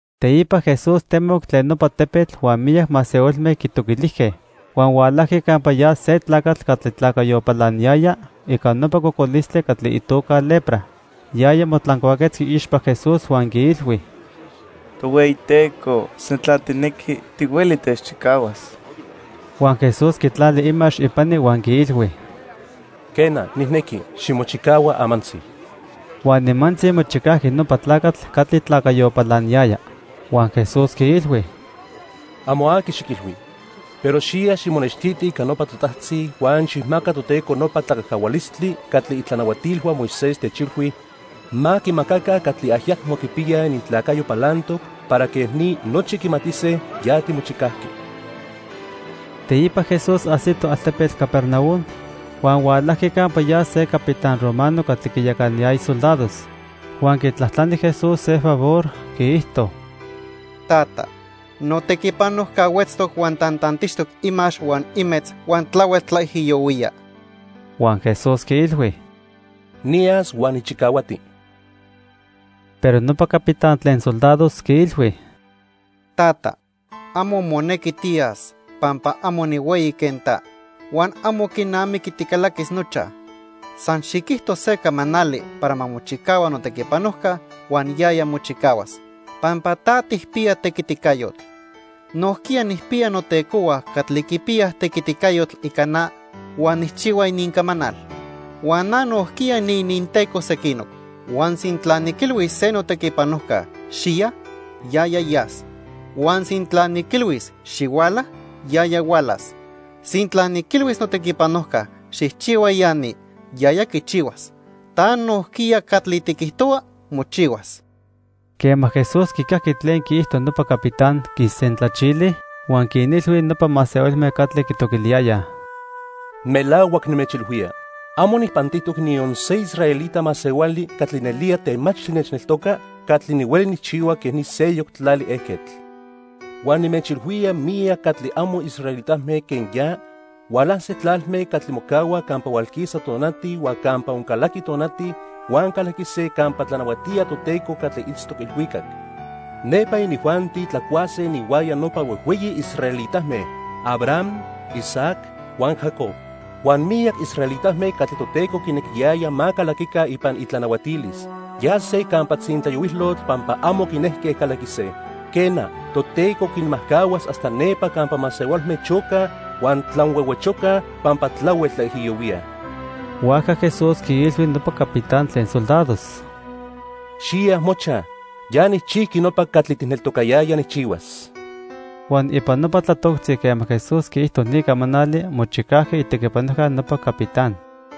Teipa Jesús temoc tlen nopa tepetl huan miyac masehualme quitoquilijque. Huan hualajqui campa ya se tlacatl catli tlacayo palaniyaya ica nopa cocolistli catli itoca lepra. Yaya motlancuaquetzqui iixpa Jesús huan quiilhui: —Tohueyiteco, sintla tijnequi, tihueli techchicahuas. Huan Jesús quitlali imax ipani huan quiilhui: —Quena, nijnequi. Ximochicahua amantzi. Huan nimantzi mochicajqui nopa tlacatl catli tlacayo palaniyaya. Huan Jesús quiilhui: —Amo aqui xiquilhui. Pero xiya ximonextiti ica nopa totajtzi huan xijmaca Toteco nopa tlacajcahualistli catli itlanahuatilhua Moisés techilhui ma quimacaca catli ayacmo quipiyaj inintlacayo palantoc para quej ni nochi quimatise ya timochicajqui. Teipa Jesús ajsito altepetl Capernaum, huan hualajqui campa ya se capitán romano catli quinyacanayaya soldados. Huan quitlajtlani Jesús se favor, quiijto: —Tata, notequipanojca huetztoc huan tantantixtoc imax huan imetz huan tlahuel tlaijiyohuía. Huan Jesús quiilhui: —Niyas huan nijchicahuati. Pero nopa capitán tlen soldados quiilhui: —Tata, amo monequi tiyas pampa amo nihueyi quen ta, huan amo quinamiqui ticalaquis nochaj. San xiquijto se camanali para ma mochicahua notequipanojca huan yaya mochicahuas, pampa ta tijpiya tequiticayotl. Nojquiya nijpiya notecohua catli quipiyaj tequiticayotl ica na huan nijchihua inincamanal. Huan na nojquiya niininteco sequinoc. Huan sintla niquilhuis se notequipanojca: 'Xiya', yaya yas, huan sintla niquilhuis: 'Xihuala', yaya hualas. Sintla niquilhuis notequipanojca: 'Xijchihua ya ni', yaya quichihuas. Ta nojquiya catli tiquijtohua, mochihuas. Quema Jesús quicajqui tlen quiijto nopa capitán, quisentlachili, huan quinilhui nopa masehualme catli quitoquiliyayaj: —Melahuac nimechilhuía, amo nijpantijtoc niyon se israelita masehuali catli nelía temachtli nechneltoca catli nihueli nijchihua quen ni seyoc tlali ejquetl. Huan nimechilhuía miyac catli amo israelitame quen ya hualase tlalme catli mocahua campa hualquisa tonati huan campa oncalaqui tonati huan calaquise campa tlanahuatía Toteco catli itztoc ilhuicac. Nepa inijuanti tlacuase ininhuaya nopa huejhueyi israelitame: Abraham, Isaac huan Jacob. Huan miyac israelitame catli Toteco quinequiyaya ma calaquica ipan itlanahuatilis, yase campa tzintlayohuilotl pampa amo quinejque calaquise. Quena, Toteco quinmajcahuas hasta nepa campa masehualme chocaj huan tlanhuehuechocaj pampa tlahuel tlaijiyohuíaj. Huajca Jesús quiilhui nopa capitán tlen soldados: —Xiya mochaj. Ya nijchijqui nopa catli tijneltocayaya nijchihuas. Huan ipan nopa tlatoctzi quema Jesús quiijto ni camanali, mochicajqui itequipanojca nopa capitán.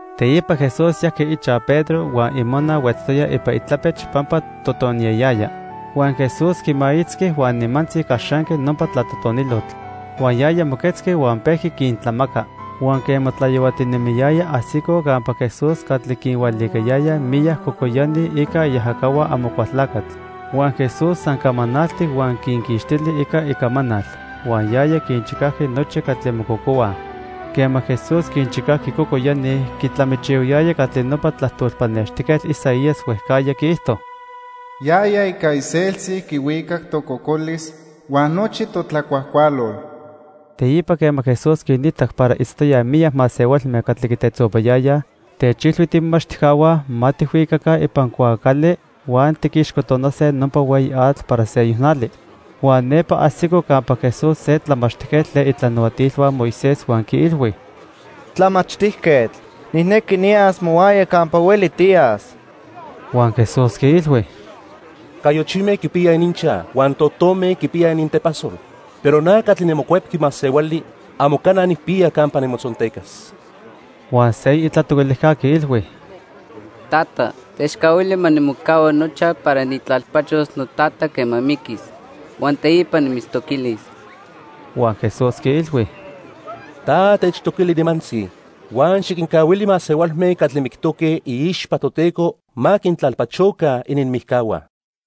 Teipa Jesús yajqui ichaj Pedro huan imona huetztoya ipan itlapech pampa totoniyayaya. Huan Jesús quimaitzqui huan nimantzi caxanqui nopa tlatotonilotl. Huan yaya moquetzqui huan pejqui quintlamaca. Huan quema tlayohuatinemiyaya, ajsicoj campa Jesús catli quinhualicayayaj miyac cocoyani ica iajacahua Amocualtlacatl. Huan Jesús san camanaltic huan quinquixtili ica icamanal. Huan yaya quinchicajqui nochi catli mococohuaj. Quema Jesús quinchicajqui cocoyani, quitlamichihuayaya catli nopa tlajtol pannextijquetl Isaías huejcajya quiijto: "Yaya ica iseltzi quihuicac tococolis huan nochi totlacuajcualol." Teipa quema Jesús quinitac para itztoyaj miyac masehualme catli quitetzopayayaj, techilhui tiimomachtijcahua ma tijhuicaca ipan cuaacali huan tiquixcotonase nopa hueyi atl para seyoc nali. Huan nepa ajsico campa Jesús se tlamachtijquetl tlen itlanahuatilhua Moisés huan quiilhui: —Tlamachtijquetl, nijnequi niyas mohuaya campa hueli tiyas. Huan Jesús quiilhui: —Cayochime quipiyaj ininchaj huan totome quipiyaj inintepasol, pero na catli niMocuepqui Masehuali amo cana nijpiya campa nimotzontecas. Huan seyoc itlatoquilijca quiilhui: —Tata, techcahuili ma nimocahua nochaj para nijtlalpachos notata quema miquis, huan teipa nimitztoquilis. Huan Jesús quiilhui: —Ta techtoquili nimantzi, huan xiquincahuili masehualme catli mictoque iixpa Toteco ma quintlalpachoca ininmijcahua.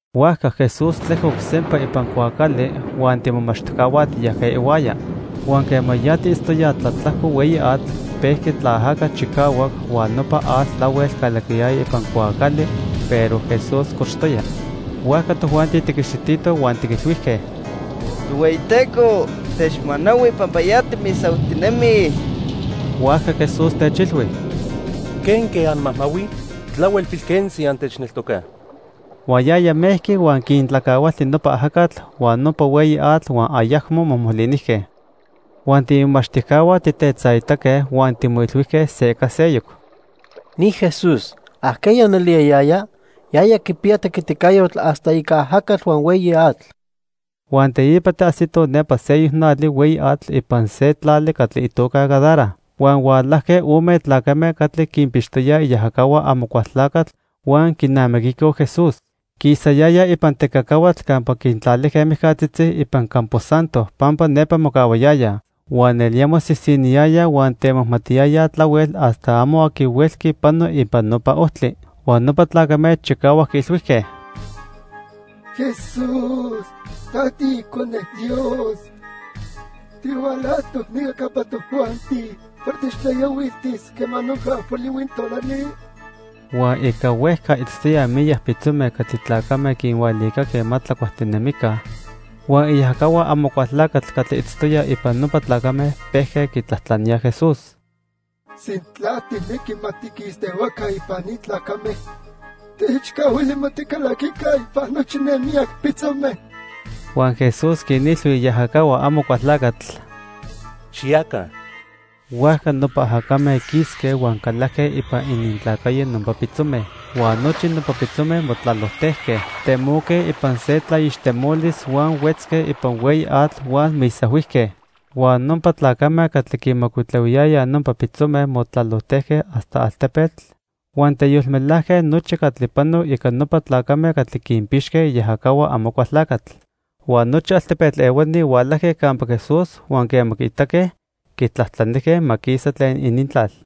Huajca Jesús tlejcoc sempa ipan cuaacali huan tiimomachtijcahua tiyajque ihuaya. Huan quema ya tiitztoyaj tlatlajco hueyi atl, pejqui tlaajaca chicahuac huan nopa atl tlahuel calaquiyaya ipan cuaacali, pero Jesús cochtoya. Huajca tojuanti tiquixititoj huan tiquilhuijque: —Tohueyiteco, techmanahui pampa ya timisahuijtinemij. Huajca Jesús techilhui: —¿Quenque anmajmahuij? Tlahuel pilquentzi antechneltocaj. Huan yaya mejqui huan quintlacahualti nopa ajacatl huan nopa hueyi atl huan ayacmo mojmolinijque. Huan tiimomachtijcahua tijtetzaitaque huan timoilhuijque se ica seyoc: —Ni Jesús, ¿ajqueya nelía yaya? Yaya quipiya tequiticayotl hasta ica ajacatl huan hueyi atl. Huan teipa tiajsitoj nepa seyoc nali hueyi atl ipan se tlali catli itoca Gadara. Huan hualajque ome tlacame catli quinpixtoyaj iajacahua Amocualtlacatl huan quinamiquicoj Jesús. Quisayayaj ipan tecacahuatl campa quintlalijque mijcatzitzi ipan campo santo pampa nepa mocahuayayaj. Huan nelía mosisiniyayaj huan temajmatiyayaj tlahuel hasta amo aqui huelqui pano ipan nopa ojtli. Huan nopa tlacame chicahuac quiilhuijque: —Jesús, ta tiIcone Dios. ¿Tihualajtoc nica campa tojuanti para techtlaijiyohuiltis quema noja polihui tonali? Huan ica huejca itztoyaj miyac pitzome catli tlacame quinhualicaque ma tlacuajtinemica. Huan iajacahua Amocualtlacatl catli itztoyaj ipan nopa tlacame pejque quitlajtlaníaj Jesús: —Sintla tijnequi ma tiquistehuaca ipan ni tlacame, techcahuili ma ticalaquica ipan nochi ne miyac pitzome. Huan Jesús quinilhui iajacahua Amocualtlacatl: —Xiyaca. Huajca nopa ajacame quisque huan calajque ipan inintlacayo nopa pitzome. Huan nochi nopa pitzome motlalojtejque. Temoque ipan se tlaixtemolis, huan huetzque ipan hueyi atl huan misahuijque. Huan nopa tlacame catli quinmocuitlahuiyayaj nopa pitzome motlalojtejque hasta altepetl huan teyolmelajque nochi catli panoc ica nopa tlacame catli quinpixque iajacahua Amocualtlacatl. Huan nochi altepetl ehuani hualajque campa Jesús huan quema quiitaque, quitlajtlanijque ma quisa tlen inintlal.